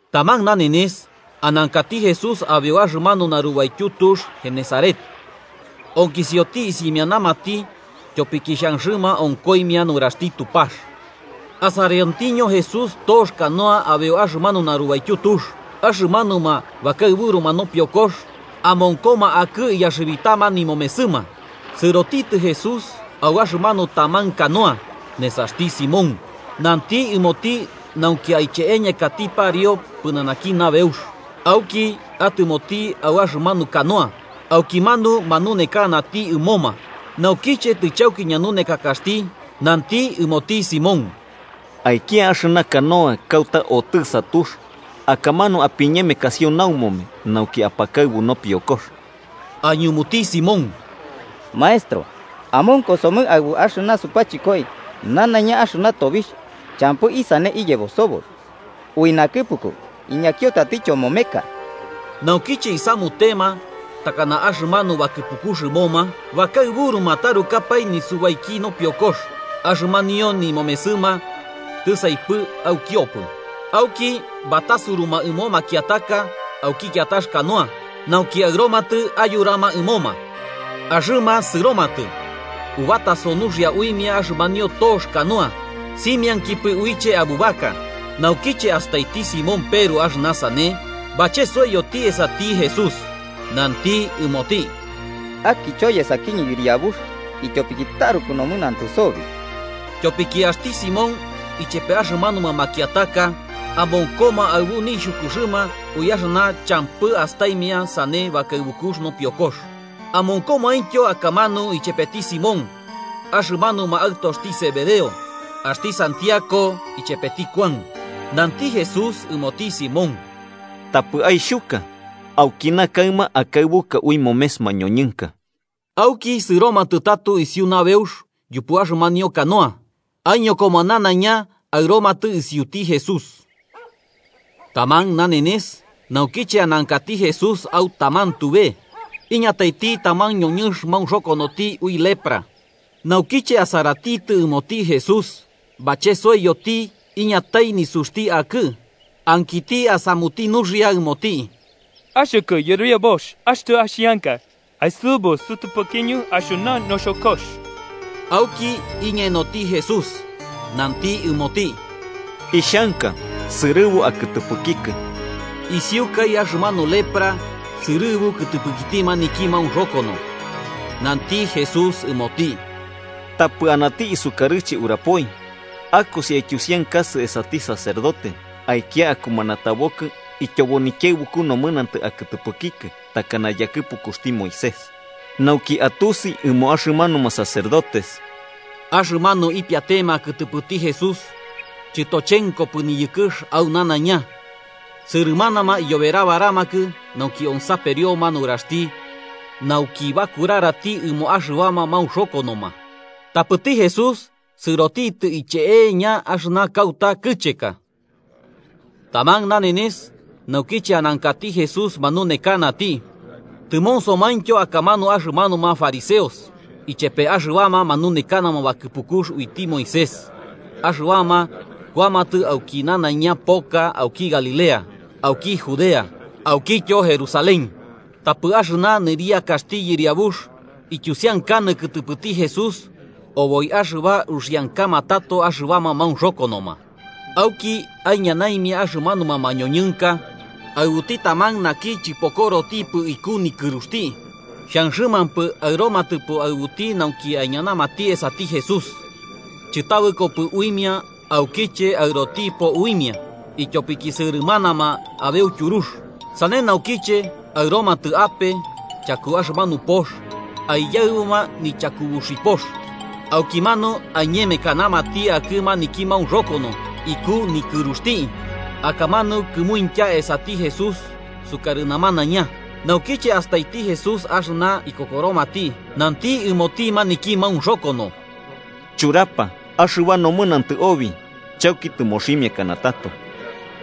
Taman nanenes, anankati Jesús abeu axɨmanu narubaityu tux Genesaret, onkisioti isimianamati tyopiki xhanxɨma onkoimia nuraxti Tupax. Asariontiño Jesús tox canoa abeu axɨmanu narubaityu tux. Axɨmanuma bakaɨburuma nopiokox amonkoma akɨ iyaxɨbitama nimomesɨma. Sɨroti Jesús au axɨmanu taman canoa, nesaxti Simón, nanti ɨmoti nauki aiche'eñakati pariu pɨnanaki nabeux. Auki atɨmoti au axɨmanu canoa, aukimanu manunekanati ɨmoma. Naukiche tɨchauki ñanunekakaxti, nanti ɨmoti Simón: –Aikia axɨna canoa axɨna kauta otɨ'ɨsa axɨna tux, akamanu apiñemekasio naumome, nauki apakaɨbu nopiokox. Aiñumuti Simón: –Maestro, amonkosomɨ aɨbu axɨna supachɨkoi nanaiña axɨna tobixh champɨ isane iyebo soboi. Ui nakɨpuku, iñakio tatityo momeka. Naukiche isamutema takana axɨmanu bakɨpukux ɨmoma, bakaɨburuma tarukapae nisubaiki nopiokoka axɨmanio nimomesɨma tɨsaipɨ aukiopɨ. Auki batasuruma ɨmo makiataka auki kiatax canoa, nauki aɨromatɨ ayurama ɨmoma. Axɨma sɨromatɨ, ubataso nuxia uimia axɨmanio tox canoa simiainkipɨ uiche abubaka. Naukiche astaiti Simón Peru axɨna sane, bachesoiyoti esati Jesús nanti ɨmoti: –¡Akicho yesakiñɨ, Yɨriabux, ityopiki taruku nomɨnantɨ sobi! Tyopiki axti Simón ichepe axɨmanuma makiataka amonkoma aɨbu nixhukuxɨma ui axɨna champɨ astaimia sane bakaɨbukux nopiokox. Amonkomaintyo akamanu chepeti Simón axɨmanuma aɨtoxti Zebedeo, axti Santiago ichepeti Kuan. Nanti Jesús ɨmoti Simón: –Tapɨ aixhuka. Aukina kaɨma akaɨbuka ui momes mañoñɨnka. Auki sɨromatɨ tato isiu nabeux yupu axɨmanio canoa, aiñokoma nanaiña aɨromatɨ isiuti Jesús. Taman nanenes, naukiche anankati Jesús au taman tube, iñataiti taman ñoñɨnx maunxokonoti ui lepra. Naukiche asaratitɨ ɨmoti Jesús, bachesoiyoti iñatai nisuxti akɨ ankiti asamuti nuxia ɨmoti: –Axɨkɨ Yɨriabux, axtɨ axianka, aisɨbu sɨtɨpɨkiñɨ axɨna noxokox. Auki iñenoti Jesús, nanti ɨmoti: –Ixhanka. ¡Sɨrɨbu akɨtɨpɨkikɨ! Isiukai axɨmanu lepra sɨrɨbu kɨtɨpɨkiti maniki maunxokono, nanti Jesús ɨmoti: –Tapɨ anati isukarɨche urapoi. Akosi aityusiankasɨ esati sacerdote, aikia akumanatabokɨ ityobo nikiaɨbuku nomɨnantɨ akɨtɨpɨkikɨ takana yakɨpukuxti Moisés, nauki atusi ɨmo axɨmanuma sacerdotes. Axɨna ipiatema kɨtɨpɨti Jesús chɨtochenkopɨ niyɨkɨx au nanaiña, sɨrɨmanama iyoberabaramakɨ nauki onsaperioma nuraxti nauki bakurarati ɨmoma axɨbama maunxokonoma. Tapɨti Jesús sɨrotitɨ iche'eña axɨna kauta kɨcheka. Taman nanenes naukiche anankati Jesús manunekanati, tɨmonsomaintyo akamanu axɨmanuma fariseos ichepe axɨbama manunekanama bakɨpukux uiti Moisés axɨbama kuamatɨ auki nanaiña poka auki Galilea, auki Judea, aukityo Jerusalén. Tapɨ axɨna nɨriakaxti Yɨriabux ityusiankanɨ kɨtɨpɨti Jesús oboi axɨba uxiankama tato axɨbama maunxokonoma uiti. Auki aiñanaimia axɨmanuma mañoñɨnka aɨbuti taman naki chɨpokorotipɨ iku nikɨruxti. Xhanxɨmampɨ aɨromatɨpo aɨbuti nauki aiñanamati esati Jesús, chɨtabɨkopɨ uimia aukiche aɨrotipo uimia, ityopiki sɨrɨmanama abeu tyurux. Sane naukiche aɨromatɨ ape chaku axɨmanu pox, aiyaɨbuma nichakubuxipox, aukimanu aiñemekanamati akɨ maniki maunxokono iku nikɨruxti, akamanu kɨmuintya esati Jesús sukarɨ namanaiña. Naukiche astaiti Jesús axɨna ikokoromati, nanti ɨmoti maniki maunxokono: –Churapa, axɨba nomɨnantɨ obi chauki tɨmoximiakana tato.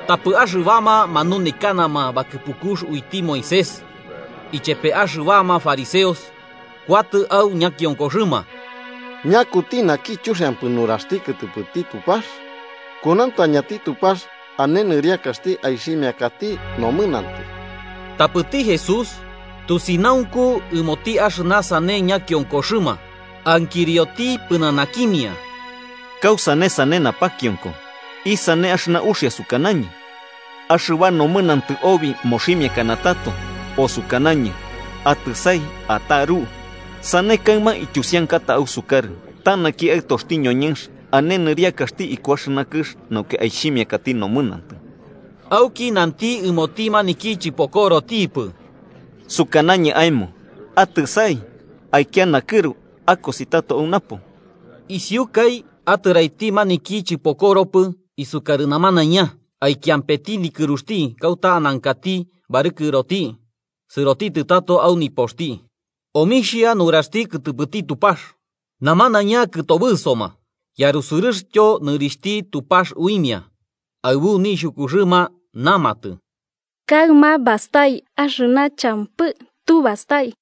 Tapɨ axɨbama manunekanama bakɨpukux uiti Moisés ichepe axɨbama fariseos kuatɨ au ñakionkoxɨma: “¿Ñakuti naki chuxiampɨ nuraxti kɨtɨpɨti Tupax? Kunauntañati Tupax ane nɨriakaxti aixhimiakati nomɨnantɨ.” Tapɨti Jesús tusinaunku ɨmoti axɨna sane ñakionkoxɨma, ankirioti pɨnanakimia: –¿Kausane sane napakionko? ¿Isane axɨna uxia sukanañɨ: ‘Axɨba nomɨnantɨ obi moximiakana tato’, o sukanañɨ: ‘Atɨsai ataru’? Sane kaɨma ityusiankata ausukarɨ ta naki Aɨtoxti ñoñɨnx ane nɨriakaxti iku axɨna kɨx nauki aixhimiakati nomɨnantɨ. Auki nanti ɨmoti maniki chɨpokorotipɨ: –Sukanañɨ aemo, atɨsai, aikia nakɨru, akosi tato au napo. Isiukai, atɨraiti maniki chɨpokoropɨ isukarɨ namanaiña, aikiampeti nikɨruxti kauta anankati barɨkɨroti sɨrotitɨ tato au nipoxti omixhia nuraxti kɨtɨpɨti Tupax. Namanaiña kɨtobɨsoma yarusɨrɨxtyo nɨrixhti Tupax uimia, aɨbu nixhukuxɨma namatɨ: –Kaɨma bastai axɨna champɨ tu bastai.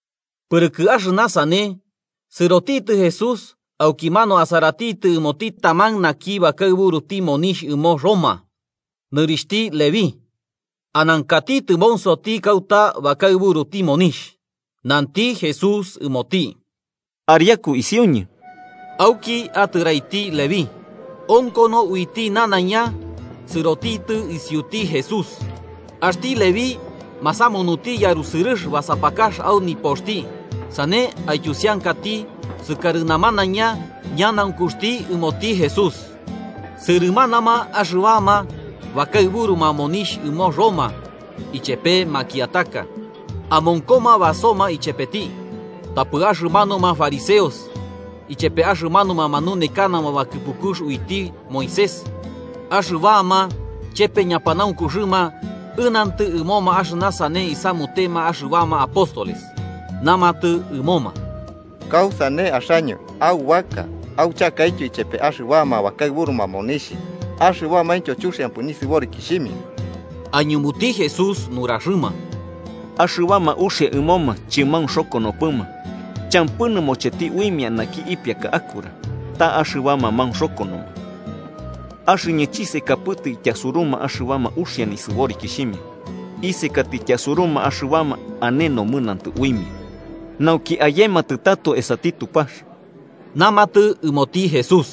Pɨrɨkɨ axɨna sane, sɨrotitɨ Jesús aukimanu asaratitɨ ɨmoti taman naki bakaɨburuti monixh ɨmo Roma. Nɨrixhti Leví, anankati tɨmonsoti kauta bakaɨburuti monixh. Nanti Jesús ɨmoti: –Ariaku isiuñɨ. Auki atɨraiti Leví, onkono uiti nanaiña sɨrotitɨ isiuti Jesús. Axti Leví masamunuti yarusɨrɨx basapakax au nipoxti sane aityusiankati sukarɨ namanaiña ñanaunkuxti ɨmoti Jesús. Sɨrɨmanama axɨbama bakaɨburuma monixh ɨmo Roma, ichepe makiataka. Amonkoma basoma ichepeti. Tapɨ axɨmanuma fariseos ichepe axɨmanuma manunekanama bakɨpukux uiti Moisés axɨbama chepe ñapanaunkuxɨma ɨnantɨ ɨmoma axɨna sane isamutema axɨbama apóstoles. Namatɨ ɨmoma: –¿Kausane axaño aubaka auchakaityo ichepe axɨbama bakaɨburuma monixh axɨbamaintyo chuxiampɨ nisɨborikixhimia? Aiñumuti Jesús nuraxɨma: –Axɨbama uxia ɨmoma chɨmaunxokonopɨma champɨ nɨmocheti uimia naki ipiaka akura, ta axɨbama maunxokonoma. Axɨñɨ chisekapɨtɨ ityasuruma axɨbama uxia nisɨborikixhimia, isekatɨ ityasuruma axɨbama ane nomɨnantɨ uimia, nauki ayematɨ tato esati Tupax. Namatɨ ɨmoti Jesús: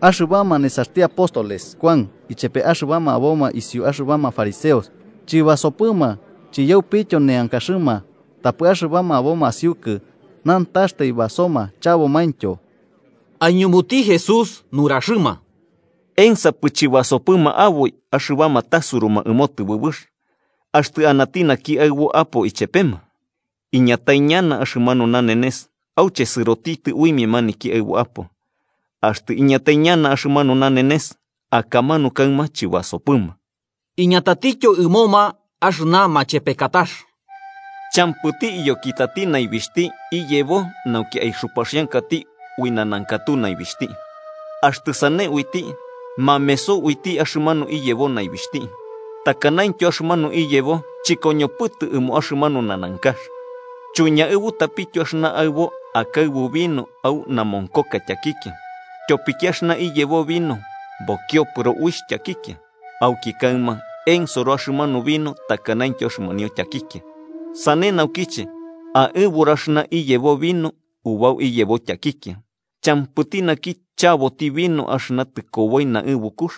–Axɨbama nesaxti apóstoles Kuan ichepe axɨbama aboma isiu axɨbama fariseos chɨbasopɨma chiyaupityo neankaxɨma, tapɨ axɨbama aboma asiukɨ nantaxtai basoma chabomaintyo. Aiñumuti Jesús nuraxɨma: –¿Ensapɨ chɨbasopɨma aboi axɨbama tasuruma ɨmo tɨbɨbɨx, axtɨ anati naki aɨbo apo ichepema? Iñatai ñana axɨmanu nanenes auche sɨrotitɨ uimia maniki aɨbo apo. Axtɨ iñatai ñana axɨmanu nanenes, akamanu kaɨma chɨbasopɨma. Iñatatityo ɨmoma axɨna machepekatax: –Champɨti iyokitati naibixhti iyebo nauki aixupaxiankati uixh nanankatu naibixhti. Axtɨ sane uiti, mameso uiti axɨmanu iyebo naibixhti. Takanaintyo, axɨmanu iyebo chɨkoñopɨtɨ ɨmo axɨmanu nanankax. Chuiñaɨbutapityo axɨna aɨbo akaɨbu vino au namonkoka tyakikia, tyopiki axɨna iyebo vino bokiopɨro uixh tyakikia, auki kaɨma ensoro axɨmanu vino takanaintyo axɨmanio tyakikia. Sane naukiche aɨburu axɨna iyebo vino ubau iyebo tyakikia. Champɨti naki chaboti vino axɨna tɨkoboi naɨbukux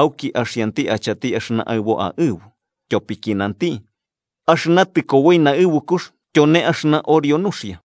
auki axianti achati axɨna aɨbo aɨbu, tyopiki nanti: ‘Axɨna tɨkoboi naɨbukux tyone axɨna orio nuxia.’